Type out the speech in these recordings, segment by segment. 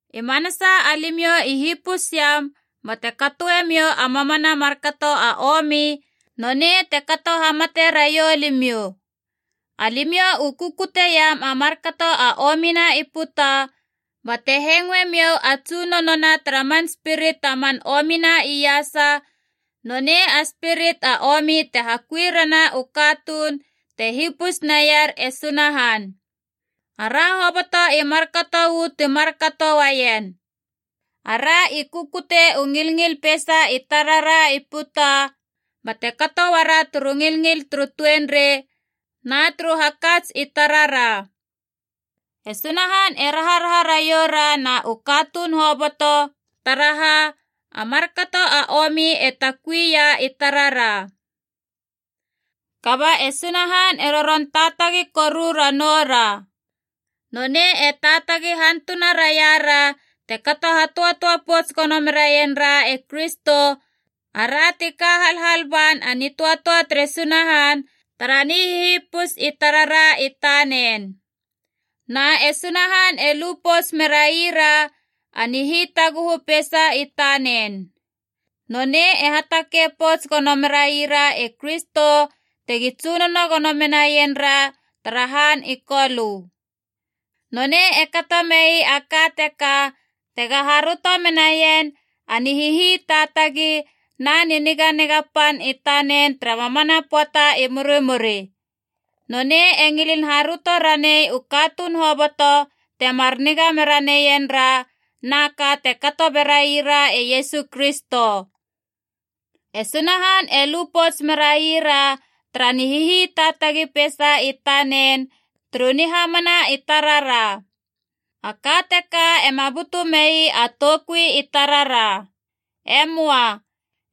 I manasa alimiou i hipusiam bate katoe miou a mamana a markato a omi, nonei te kato hamate raiou limiou. Alimiou u kukuteiam a markato a omina i puta, bate hengoemiou a tsunonona tara man spirit a man omina iasa, nonei a spirit a omi te hakui rena u katuun te hipus naier e Sunahan. Ara hoboto i markato uu ti kato uaien. Ara i kukute u ngilngil peisa i tarara i puta, bate kato uara turu ngilngil turu tuenrei na turu hakats i tarara. E Sunahan e raharaha raioura na u katuun hoboto, taraha a markato a omi e takui ia i tarara. Kaba e Sunahan e roron taatagi koru ranoura. Nonei e taatagi hantuna raiara te kato hatöatöa pouts gono meraien ra e Kristo, ara ti ka halhal ban a nitöatöa tere Sunahan tara nihihipus i tarara i tanen. Na e Sunahan e lu pouts meraira a nihitaguhu peisa i tanen. Nonei e hatakei pouts gono meraira e Kristo tegi tsunono gono menaien ra tara han i Kolö. Nonei e kato mei a ka teka tega haröto menaien a nihihitaatagi na niniganiga pan i tanen tara mamana pöata i murimuri. Nonei e ngilin haröto ranei u katuun hoboto temar niga mera neien ra, na ka te kato berai ra e Iesu Kristo. E Sunahan e lu pouts merai ra tara nihihitaatagi peisa i tanen turu nihamana i tarara. A ka teka ema butu mei a toukui i tarara. E möa.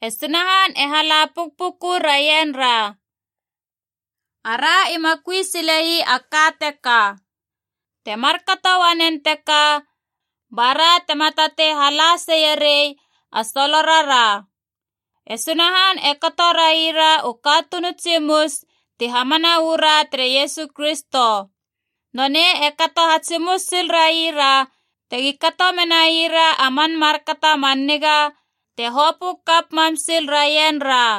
E Sunahan e hala pukpuku raienra. Ara ima kui sile ii a ka teka. Te markato uanen teka bara tema tatei hala seie rei a solorara. E Sunahan e kato raira u katuun u tsimus ti hamana uu ra tere Iesu Kristo. Nonei e kato hatsimus sil raira tegi kato menaira a man markato a man niga te hopö kap mam sil raien ra.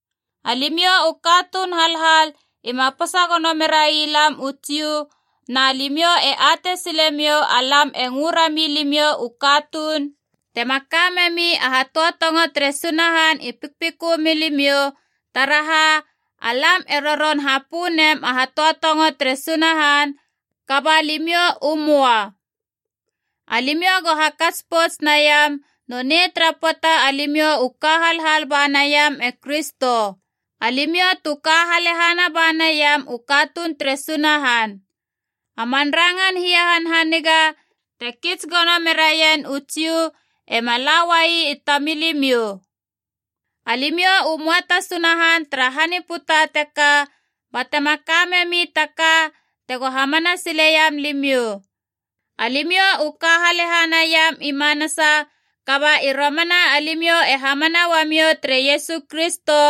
Alimiou u katuun halhal ima posa gono merai lam u Jiu, na limiou e atei silemiou alam e ngö rami limiou u katuun tema ka memi a hatöatongo tere Sunahan i pikpikö milimiou, taraha alam e roron hapö nem a hatöatongo tere Sunahan kaba limiou u möa. Alimiou go hakats pouts naiam nonei tara pöata alimiou u ka halhal ba naiam e Kristo. Alimiou tu ka halehana ba naiam u katuun tere Sunahan. A man rangan hiahanhaniga te kits gono meraien u Jiu ema la uai i tamilimiou. Alimiou u möa ta Sunahan tara han i puta teka, batema ka memi ta ka tego hamana sileiam limiou. Alimiou u ka halehana iam i manasa, kaba i romana alimiou e hamana uamiou tere Iesu Kristo,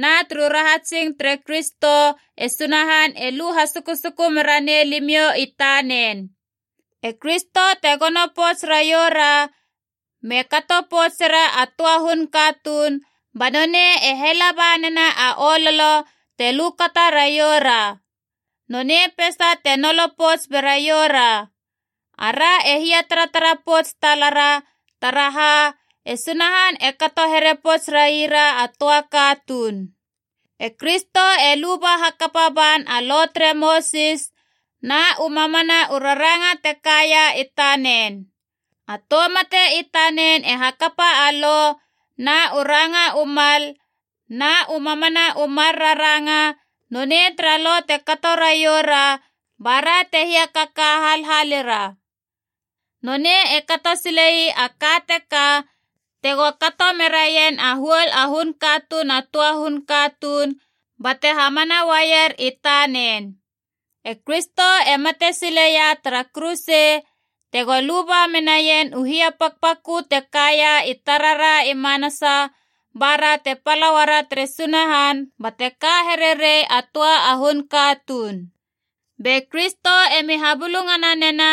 na turu rahatsing tere Kristo e Sunahan e lu hasukusuku meranei limiou i tanen. E Kristo te gono pouts raioura me kato poutsera a töa hun katuun, ba nonei e hela banena a ololo te lukata raioura. Nonei peisa te nolo pouts beraiou ra. Ara e hiataratara pouts talara, taraha e Sunahan e kato here pouts raira a töa katuun. E Kristo e luba hakapa ban a Lo tere Mosis na u mamana u raranga te kaia i tanen. A tou mate i tanen e hakapa a Lo na u ranga u mal na u mamana u mar raranga nonei tara Lo te kato raiou ra bara te hiakaka halhalira. Nonei e kato sile ii a ka teka tego kato meraien a huol a hun katuun a töa hun katuun bate hamana uaier i tanen. E Kristo e mate sileia tara kuruse tego luba menaien u hiapakpakö te kaia i tarara i manasa, bara te pala uara tere Sunahan bate ka here rei a töa a hun katuun. Be Kristo emi habulungana nena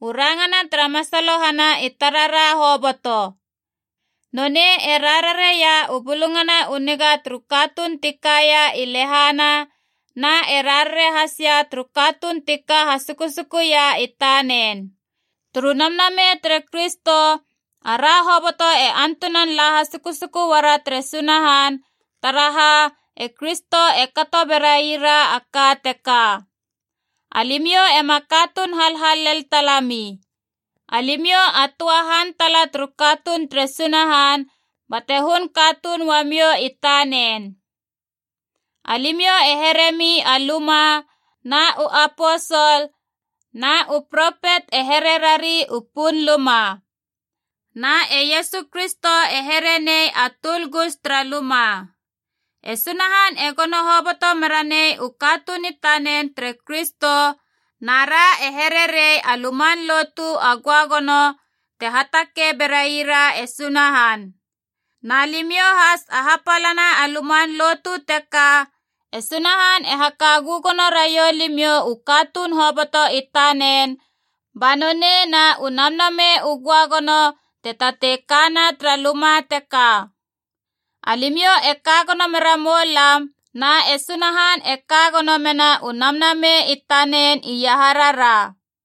u rangana tara masalohana i tarara hoboto. Nonei e rarareia u Bulungana u Niga turu katuun ti kaia i lehana, na e rarare has ia turu katuun ti ka hasukusukuia i tanen. Turu Namnamei tere Kristo ara hoboto e antunan la hasukusuku uara tere Sunahan, taraha e Kristo e kato berai ra a ka teka. Alimiou ema katuun halhal lel talami. Alimiou a töa han tala turu katuun tere Sunahan, bate hun katuun uamiou i tanen. Alimiou e heremi a luma, na u aposol na u propet e here rari u punluma. Na e Iesu Kristo e here nei a tuulgus tara luma. E Sunahan e gono hoboto meranei u katuun i tanen tere Kristo, na ra e here rei a luman lotu a göagono te hatakei bera ii ra e Sunahan. Na limiou has a hapalana a luman lotu teka, e Sunahan e haka gögono raiou limiou u katuun hoboto i tanen, banonei na u Namnamei u Göagono te tatei kana tara luma teka. Alimiou e ka gono mera moulam na e Sunahan e ka gono mena u Namnamei i tanen iaharara.